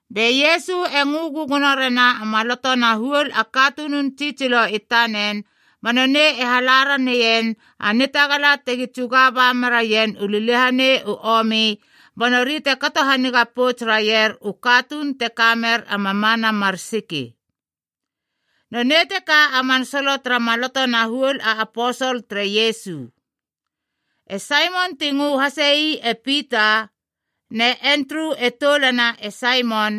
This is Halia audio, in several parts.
Be Iesu e ngö gögono rena a maloto na huol a katunun tsitsilo i tanen ba nonei e hala raneien a nitagala tegi tsuga ba meraien u liliahanei u omi ba nori te kato haniga pouts raier u katuun te ka mer a mamana mar siki. Nonei teka a man solo tara maloto na huol a aposol tere Iesu: E Saimon ti ngö hasei e Pita. Ne Endru e toulana e Saimon.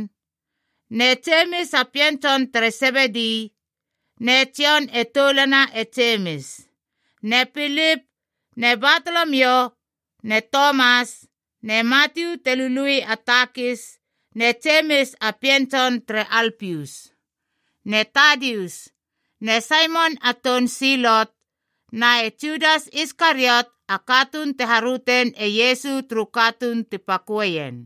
Ne Jemis a pien tson tere Sebedi. Ne Jon e toulana e Jemis. Ne Pilip, ne Batolomio, ne Tomas, ne Matiu te lului a takis, ne Jemis a pien tson tere Alpius, ne Tadius, ne Saimon a toun Silot, na e Judas Iskariot a katuun te harötein e Iesu turu katuun ti paköeien.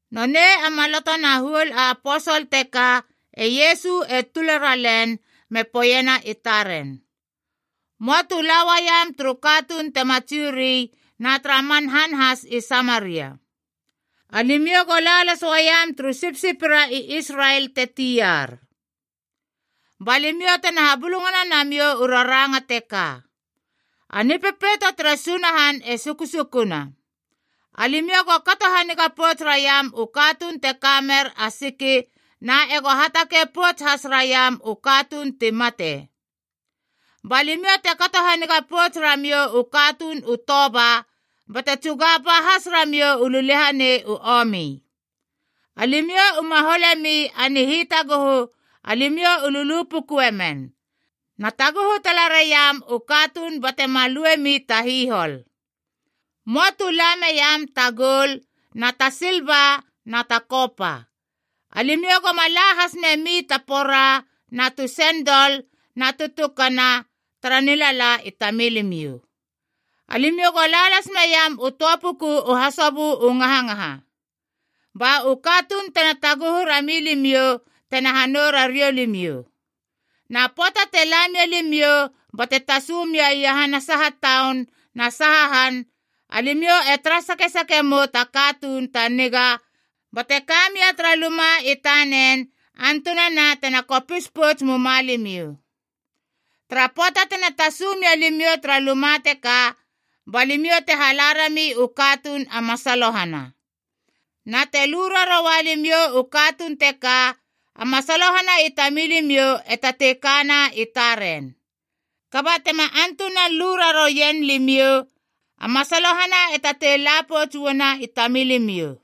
Nonei a maloto na huol a aposol teka e Iesu e tula ralen me poeiena i taren, “Möa tu la uaiam turu katuun tema Jiu ri na tara man han has i Samaria. Alimiou go la las uaiam turu sipsipira i Israel te tiar. Ba limiou tena habulungana namiou u raranga teka: ‘A Nipepeito tere Sunahan e sukusukuna!’ Alimiou go kato haniga pouts raiam u katuun te ka mer a siki na ego hatakei pouts has raiam u katuun ti mate. Ba limiou te kato haniga pouts ramiou u katuun u toba bate tsuga ba has ramiou u liliahanei u omi. Alimiou uma hole mi a nihitaguhu alimiou u lu pukpukuemen, na taguhu tala raiam u katuun bate ma luemi ta hihol. Möa tu la meiam ta goul na ta silba na ta kopa. Alimiou goma la has memi ta pora na tu sendol na tu tukana tara nilala i tamilimiou. Alimiou go la las meiam u töa puku u hasobö u ngahangaha. Ba u katuun tena taguhu rami limiou tena hanou rariou limiou. “Na pöata te la mia limiou bate tasu mia iahana saha taun na saha han, alimiou e tara sakesake mou ta katuun ta niga bate kamia tara luma i tanen antunana tena kopis pouts muma limiou. Tara pöata tena tasu mia limiou tara luma teka, ba limiou te hala rami u katuun a masalohana. Na te lu raroua limiou u katuun teka, a masalohana i tamilimiou e tatei kana i taren. Kaba tema antunan lu rarouien limiou, a masalohana e tatei la pouts uana i tamilimiou.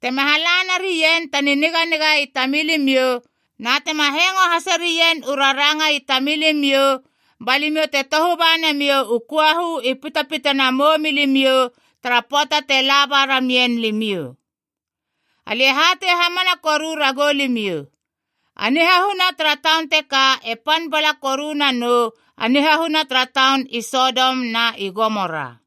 Tema hala narien ta niniganiga i tamilimiou na tema hengo haserien u raranga i tamilimiou ba limiou te tohu ba namiou u köahu i pitapitana a moumilimiou tara pöata te la ba ramien limiou. Alia e hatei hamana koru ragou limiou, a nihahuna tara taun teka e pan bala koru nanou a nihahuna tara taun i Sodom na i Gomora.”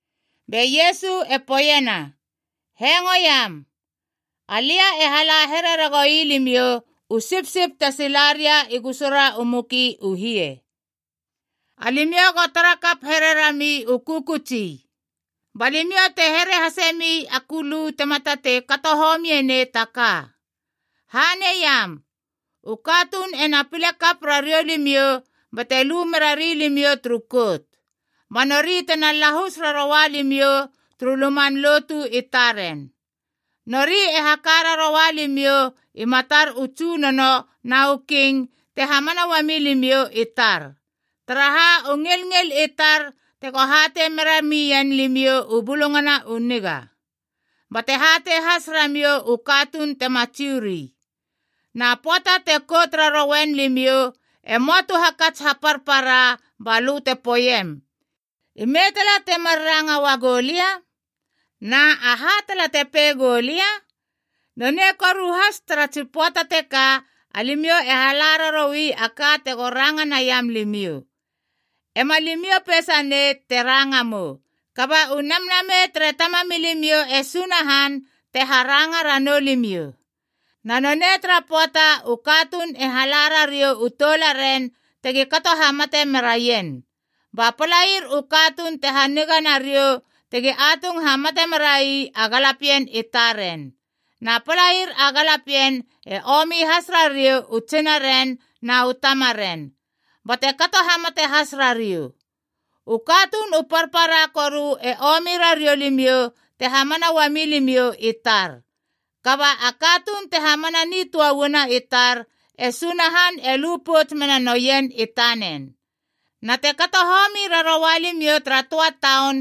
Be Iesu e poeiena, “Hengoiam! Alia e hala here ragoui limiou u sipsip te sila ria i gusura u muki u hie. Alimiou go tarakap here rami u kökötsi, ba limiou te here hase mi a kulu tema tatei kato homie nei ta ka. Haneiam, u katuun ena pile kap rariou limiou bate lu mera rilimiou turu kout, ba nori tena lahus raroua limiou turu luman lotu i taren. Nori e haka raroua limiou i matar u tsunono na u king te hamana uami limiou i tar, taraha u ngilngil i tar tego hatei meramien limiou u Bulungana u Niga, bate hatei has ramiou u katuun tema Jiu ri. Na pöata te kout rarouen limiou, e möa tu hakats haparpara balö te poeiem, ‘Ime tala temar ranga uagou lia? Na, aha tala te pei gou lia?’ Nonei koru has tara tsi pöata teka alimiou e hala raroui a ka tego ranga naiam limiou. Ema limiou peisanei te ranga mou. Kaba u Namnamei tere Tamamilimiou e Sunahan te haranga ranou limiou. “Na nonei tara pöata, u katuun e hala rariou u toularen tegi kato hamate meraien, ba a palair u katuun te haniga nariou tegi atung hamate merai a galapien i taren. Na palair a galapien e omi has rariou u tsinaren na u tamaren, bate kato hamate has rariou. U katuun u parpara koru e omi rariou limiou te hamana uami limiou i tar. Kaba a katuun te hamana nitöa uana i tar, e Sunahan e lu pouts mena noien i tanen. Na te kato homi raroa limiou tara töa taun,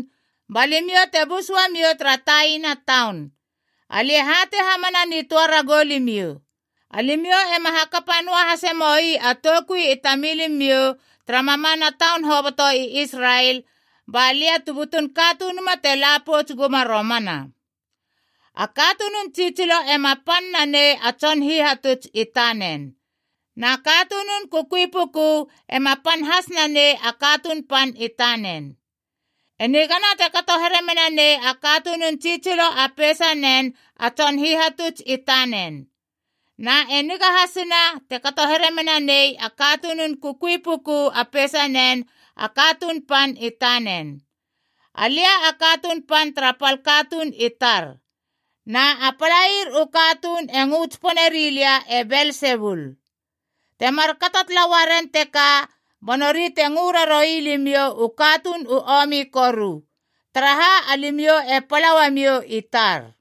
ba limiou te bus uamiou tara taina taun. Alia e hatei hamana nitöa ragou limiou, alimiou ema hakapa noa hase moi a toukui i tamilimiou tara mamana taun hoboto i Israel, ba lia tu butun Katunuma te la pouts guma romana. “A katunun tsitsilo ema pan nanei a tson hihatuts i tanen, na katunun kukui puku ema pan has nanei a katuun pan i tanen. E nigana te kato here mena nei a katunun tsitsilo a peisanen a tson hihatuts i tanen. Na e niga hasina te kato here mena nei a katunun kukui puku a peisanen a katuun pan i tanen. Alia a katuun pan tara pal katuun i tar. Na a palair u katuun e ngö tsipone rilia e Belsebul. Te markato tala uaren teka, ba nori te ngö raroui limiou u katuun u omi koru, taraha alimiou e pala uamiou i tar.”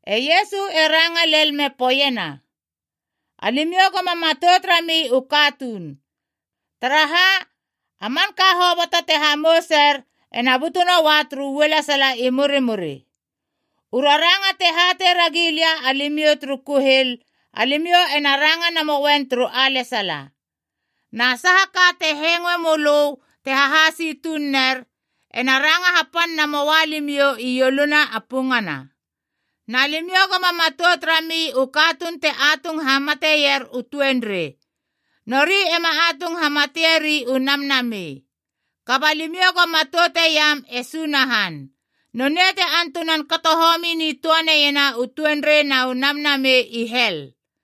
E Iesu e ranga lel me poeiena, “Alimiou goma matout rami u katuun. Taraha, a manka hoboto te hamouser ena butu noua turu ualesala i murimuri. U raranga te hatei ragi lia alimiou turu kuhil, alimiou ena ranga namouen turu alesala. Na saha ka te hengoe mölö te hahasi tuun ner, ena ranga hapan namoa limiou i ioluna a pungana. Na limiou goma matout rami u katuun te atung hamateier u tuenrei, nori ema atung hamatieri u namnamei. Kaba limiou go matouteiam e Sunahan, nonei te antunan kato homi nitoeiena u tuenrei na u namnamei i hel.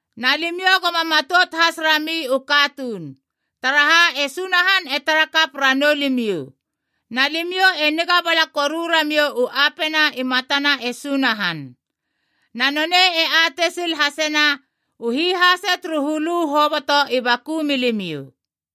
Na limiou goma matout has rami u katuun, taraha e Sunahan e tara kap ranou limiou, na limiou e niga bala koru ramiou u apena i matana e Sunahan. Na nonei e atei sil hasena u hihase turu hulu hoboto i baku milimiou.”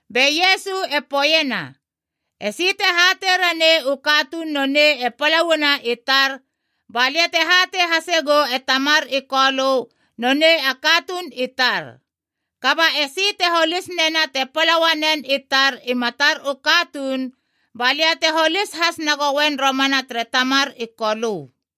Be Iesu e poeiena, “Esi te hatei ranei u katuun nonei e pala uana i tar, ba lia te hatei hase gou e Tamar i Kolö nonei a katuun i tar. Kaba esi te holis nena te pala uanen i tar i matar u katuun, ba lia te holis has nagoen romana tere Tamar i Kolö.”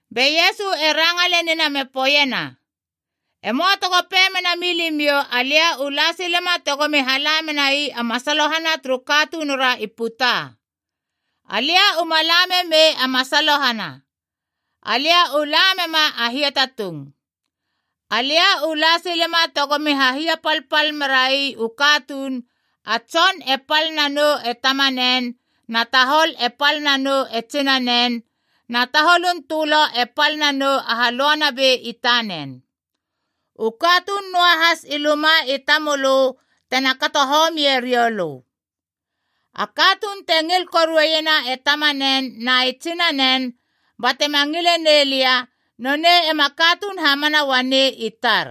Be Iesu e ranga lenina me poeiena, “Emoa tego pei mena milimiou alia u la silema tegomi hala menai a masalohana turu katunura i puta. Alia uma la memei a masalohana. Alia u la mema a hiatatung. Alia u la silema tegomi hahiapalpal merai u katuun ‘a tson e pal nanou e tamanen, na tahol e pal nanou e tsinanen, na taholun tölo e pal nanou u halöanabei i tanen. U katuun noahas i luma i tamölö tena kato homie rioulö.’ “A katuun te ngil koruena e tamanen na e tsinanen, batema ngile nei lia, nonei ema katuun hamana uanei i tar.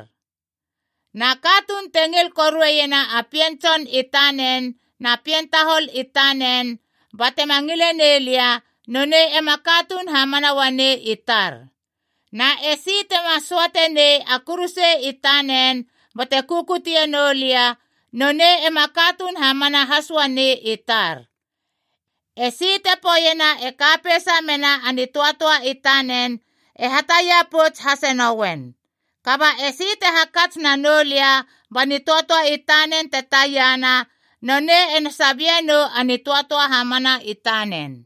Na katuun te ngil koruena a pien tson i tanen na pien tahol i tanen batema ngile nei lia, nonei ema katuun hamana uanei i tar. Na esi tema söatenei a kuruse i tanen bate kukutie noulia, nonei ema katuun hamana has uanei i tar. Esi te poeiena e ka peisa mena a nitöatöa i tanen e hatia pouts hase nouen. Kaba esi te hakats nanoulia ba nitöatöa i tanen te taiana, nonei ena sabie nou a nitöatöa hamana i tanen.”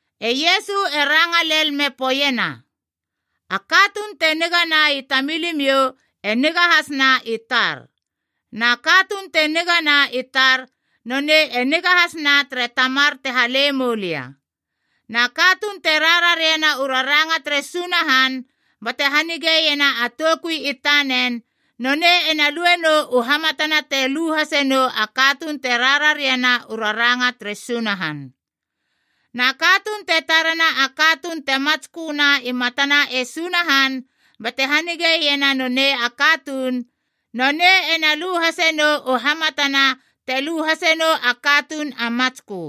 E Iesu e ranga lel me poeiena, “A katuun te nigana i tamilimiou e niga hasna i tar. Na katuun te nigana i tar, nonei e niga hasna tere Tamar te hale moulia. Na katuun te rarariena u raranga tere Sunahan, bate hanigeiena a toukui i tanen, nonei ena lue nou u hamatana te lu hase nou a katuun te rarariena u raranga tere Sunahan. Na katuun te tarena a katuun te matsköna i matana e Sunahan bate hanigeiena nonei a katuun, nonei ena lu hasenou u hamatana te lu hasenou a katuun a matskö.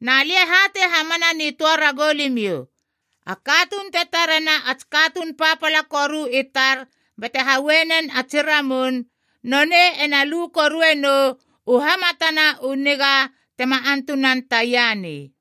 Na lia e hatei hamana nitöa ragou limiou, a katuun te tarena a tsi katuun papala koru i tar bate haue nen a tsi ramun, nonei ena lu korue nou u hamatana u niga tema antunan taia nei.”